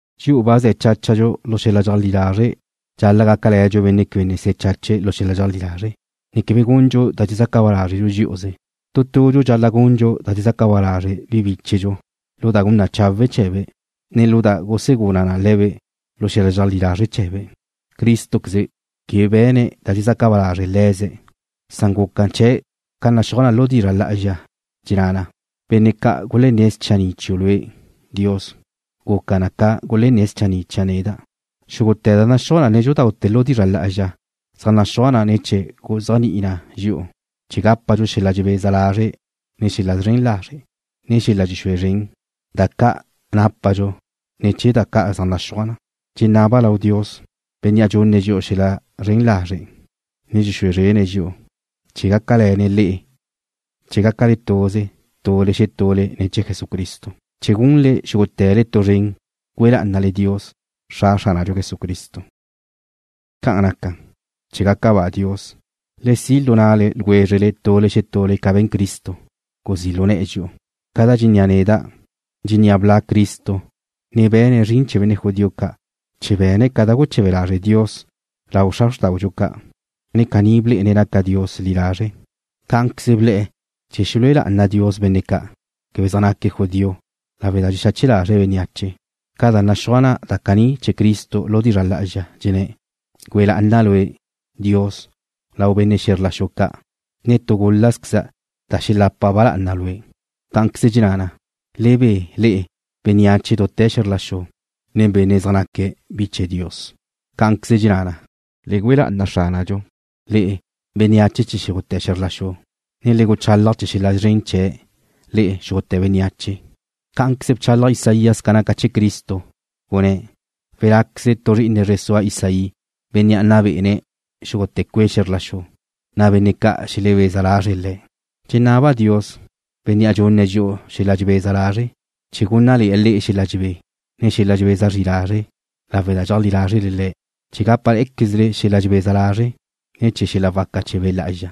Dxi'u ba ze̱ cháchadxu lu xel-la dxeajlí lazre' dxal-la' gácale̱dxu benne' quebe ne se̱ chache̱' lu xel-la dxeajlí lazre', ne quebe gundxu da dxezaca ba lázredxu dxí'uze. Tu tudxu dxal-la' gundxu da dxezaca ba lazre' bi bíchedxu lu da gun na chawe' chee̱be', ne lu da gusegula na le̱be' lu xel-la dxeajlí lazre' chee̱be'. Crístoqueze quebe be̱ne̱' da dxezaca ba lazre' le̱ze̱', san guca chee̱' ca naxúaj na lu dizra' lá'azxa, dxenná na: Benne' ca' gulenné̱' schanni' chiu' Lue', Dios, guca na ca gulenné̱' schanni' chia' neda'. Xúgute̱ da naxúaj nédxudaute̱ lu dizra' lá'azxa zaj naxúaj na chee̱ guzéajni'i na dxi'u, chee̱ gápadxu xel-la dxebeza lazre' ne̱ chee̱ xel-la zren lazre', ne xel-la dxexúe zren, da ca' nápadxu ne̱ chee̱ da ca' zaj naxúaj na. Dxenaba' lau Dios, Bénnea' dxunne̱' dxi'u xel-la zren lazre', ne dxexúe zrene̱' dxi'u, chee̱ gácale̱ne̱' le'e chee̱ gácale tuze tule xetule ne̱ chee̱ Jesucristo, chee̱ gunle xúgute̱le tu zren güe lá'anale Dios, Xra Xránadxu Jesucristo. Ca'an naca, chee̱ gaca ba Dios, le si' lu na'le ljwézrele tule xetule ca be̱n Cristo, guzí' lu ne̱'e̱ dxi'u. Ca da dxennéa' neda', dxennéa' bla' Cristo, ne be̱ne̱' zrin chee̱ benne' judío ca', chee̱ be̱ne̱' ca da guche̱be lazre' Dios lau xra xrtáudxu ca', ne caní blé'ene̱' naca Dios li lazre'. Cá'anqueze ble̱'e̱ chee̱ xelúe lá'ana Dios benne' ca' quebe zaj naque̱' judío lawe' da dxexache lazre̱' bénneache, ca da naxúaj na caní chee̱ Cristo lu dizra' lá'azxa, dxenné̱': Güe lá'ana' lue', Dios, lau benne' xe̱zr la xu ca', ne tu gul-lazqueza' da xelapa ba lá'ana Lue'. Cá'anqueze dxenná na: Le be, le'e, bénneache dute̱ xe̱zr la xu nen benne' zaj naque̱' bi chee̱ Dios. Cá'anqueze dxenná na: Le güe lá'ana Xránadxu, le'e, bénneache chee̱ xúgute̱ xe̱zr la xu, ne le guchalaj chee̱ xel-la szren chee̱', le'e, xúgute̱ bénneache. Cá'anqueze bchalaj Isaías ca naca chee̱ Cristo, gunné̱': Welá'queze tu zri'ine zre sua Isaí, Bénnea' nna bé'ene̱' xúgute̱ cue' xe̱zr la xu, na' benne' ca' xelebeza lazre̱' Le̱'. Dxenaba' Dios, Bénnea' dxunne̱' dxi'u xel-la dxebeza lazre', chee̱ gúnnale̱'e̱ le'e xel-la dxebé, ne xel-la dxebeza zri lazre' lawe' da dxeajlí lázrele Le̱', chee̱ gápale̱'e̱quezle xel-la dxebeza lazre' ne̱ chee̱ xel-la waca chee̱ Be' Lá'azxa.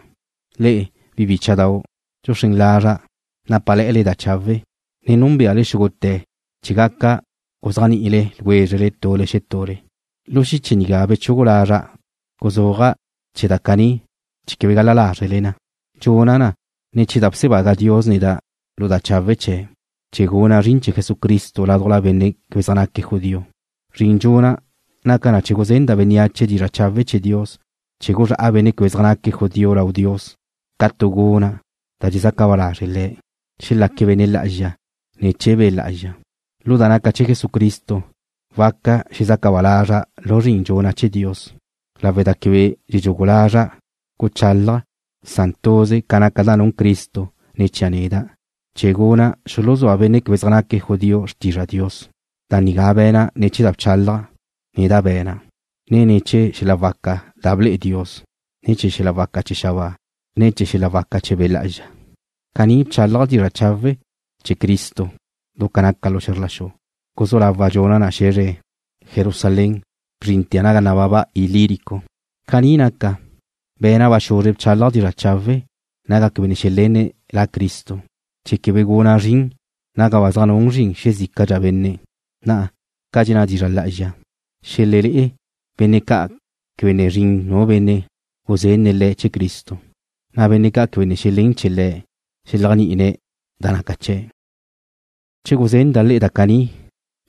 Le'e, bi bícha'dau', dxuxrén lazra' nápale̱'e̱le da chawe', ne núnbeale xúgute̱ chee̱ gaca guzéajni'ile ljwézrele tule xetule. Lu xiche nigá bechugu lazra' guzúaja' chee̱ da caní chee̱ quebe gal-la lázrele na. Dxuna' na ne̱ chee̱ da bsebaga Dios neda' lu da chawe' chee̱'. Caní guna' zrin chee̱ Jesucristo ládujla benne' quebe zaj naque̱' judío. Zrin dxuna' naca na chee̱ guzenda' bénneache dizra' chawe' chee̱ Dios chee̱ guzrá'a benne' quebe zaj naque̱' judío lau Dios ca tu guna' da dxezaca ba lazre' Le̱'. Xelaque̱' benne' lá'azxa ne̱ chee̱ Be' Lá'azxa. Lu da naca' chee̱ Jesucristo waca xezaca ba lazra' lu zrin dxuna' chee̱ Dios lawe' da quebe dxedxugu lazra' guchálaja', san tuze ca naca da nun Cristo ne̱ chia' neda', chee̱ guna' xuluzúa benne' quebe zaj naque̱' judío xrtizra Dios. Da nigá be̱na' ne̱ chee̱ da bchálaja', ne da be̱na', ne ne̱ chee̱ xel-la waca chee̱ da ble'e Dios, nen xel-la waca chee̱ xabáa, ne ne̱ chee̱ xel-la waca chee̱ Be' Lá'azxa. Caní bchálaja' dizra' chawe' chee̱ Cristo du ca naca xe̱zr la xu. Guzú lawa' dxuna' na xe̱zre Jerusalén, bzrintea' naga nababa Ilírico. Caní naca, be̱na' ba xuzre bchálaja' dizra' chawe' naga quebe ne xelenne̱' La Cristo, chee̱ quebe guna' zrin naga ba zaj nun zrin xezícadxa benne', na', ca dxenná dizra' lá'azxa: Xelelé'e benne' ca' quebe ne zrin nu benne' guzenne̱' le̱' chee̱ Cristo, na' benne' ca' quebe ne xelén chee̱ Le̱' xeléajni'ine̱ da naca chee̱'. Chee̱ guzenda' le'e da caní,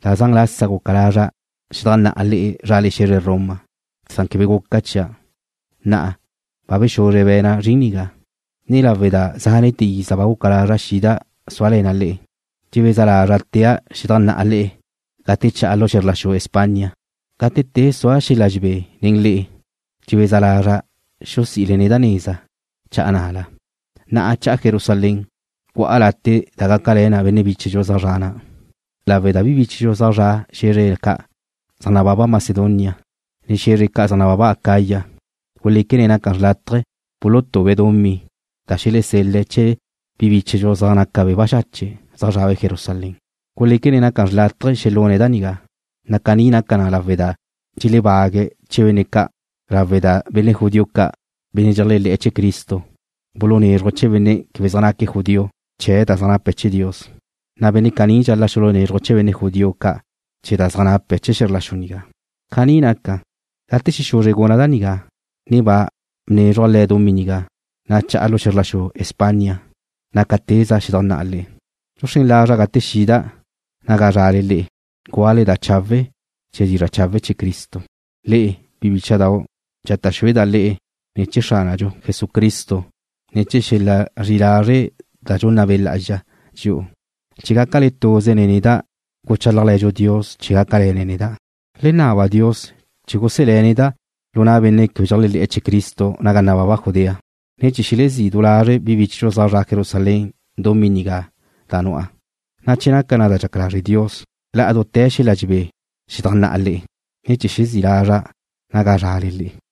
da zan lasa guca lazra' xedajnná'a le'e zrale xe̱zre Roma, san quebe guca chia'. Na'a, ba bexuzre be̱na' zrin nigá, ne lawe' da zánete̱ iza ba guca lazra' xida' súale̱na' le'e, dxebeza lazra' tea' xedajnná'a le'e gate cha'a lu xe̱zr la xu España. Gate te sua' xel-la dxebé nen le'e dxebeza lazra' xusi'ile neda' neza, na' cha'a ná'ala. Na'a cha'a Jerusalén, gu'a late' da gácale̱ na bi bíchedxu zaj zre̱'e̱ na', lawe' da bi bíchedxu zaj zre̱'e̱ xe̱zre ca' zaj nababa Macedonia, ne xe̱zre ca' zaj nababa Acaya guléquene̱' naca xrlátaje bulutube̱' dumí da xelesel-le̱' chee̱ bi bíchedxu zaj naque̱' baxache', zaj zrabe' Jerusalén. Guléquene̱' naca xrlátaje xelune̱' da nigá, na' caní naca na lawe' da dxelebague̱' chee̱ benne' ca', lawe' da benne' judío ca', benne' dxeléajle̱'e̱ chee̱ Cristo, bulunézruje̱' chee̱ benne' quebe zaj naque̱' judío chee̱ da zaj nape̱' chee̱ Dios, na' benne' caní dxal-la' xulunézruje̱' chee̱ benne' judío ca' chee̱ da zaj nape̱' chee̱ xe̱zr la xu nigá. Caní naca, gate xexuzre guna' da nigá, ne ba bnézruja' le̱' dumí nigá, na' cha'a lu xe̱zr la xu España, na' ca teza' xedajnná'a le'e. Dxuxrén lazra' gate xida' naga zrale le'e, gúale̱'a da chawe' chee̱ dizra' chawe' chee̱ Cristo. Le'e, bi bícha'dau', dxata' xúeda' le'e ne̱ chee̱ Xránadxu Jesucristo, ne ne̱ chee̱ xel-la zri'i lazre' da dxunna Be' Lá'azxa dxi'u, chee̱ gácale tuze nen neda' guchálajle̱dxu Dios chee̱ gácale̱ne̱' neda'. Le naba Dios chee̱ guselé̱' neda' lu na' benne' quebe dxeléajle̱'e̱ chee̱ Cristo naga nababa Judea, ne chee̱ xelezí' du lazre' bi bíchedxu zaj zre̱'e̱ Jerusalén dumí nigá da nu'a, na' che naca da dxaca lazre' Dios, la'a lu dute̱ xel-la dxebé xedajnná'a le'e, ne chee̱ xezí' lazra' naga zrale le'e.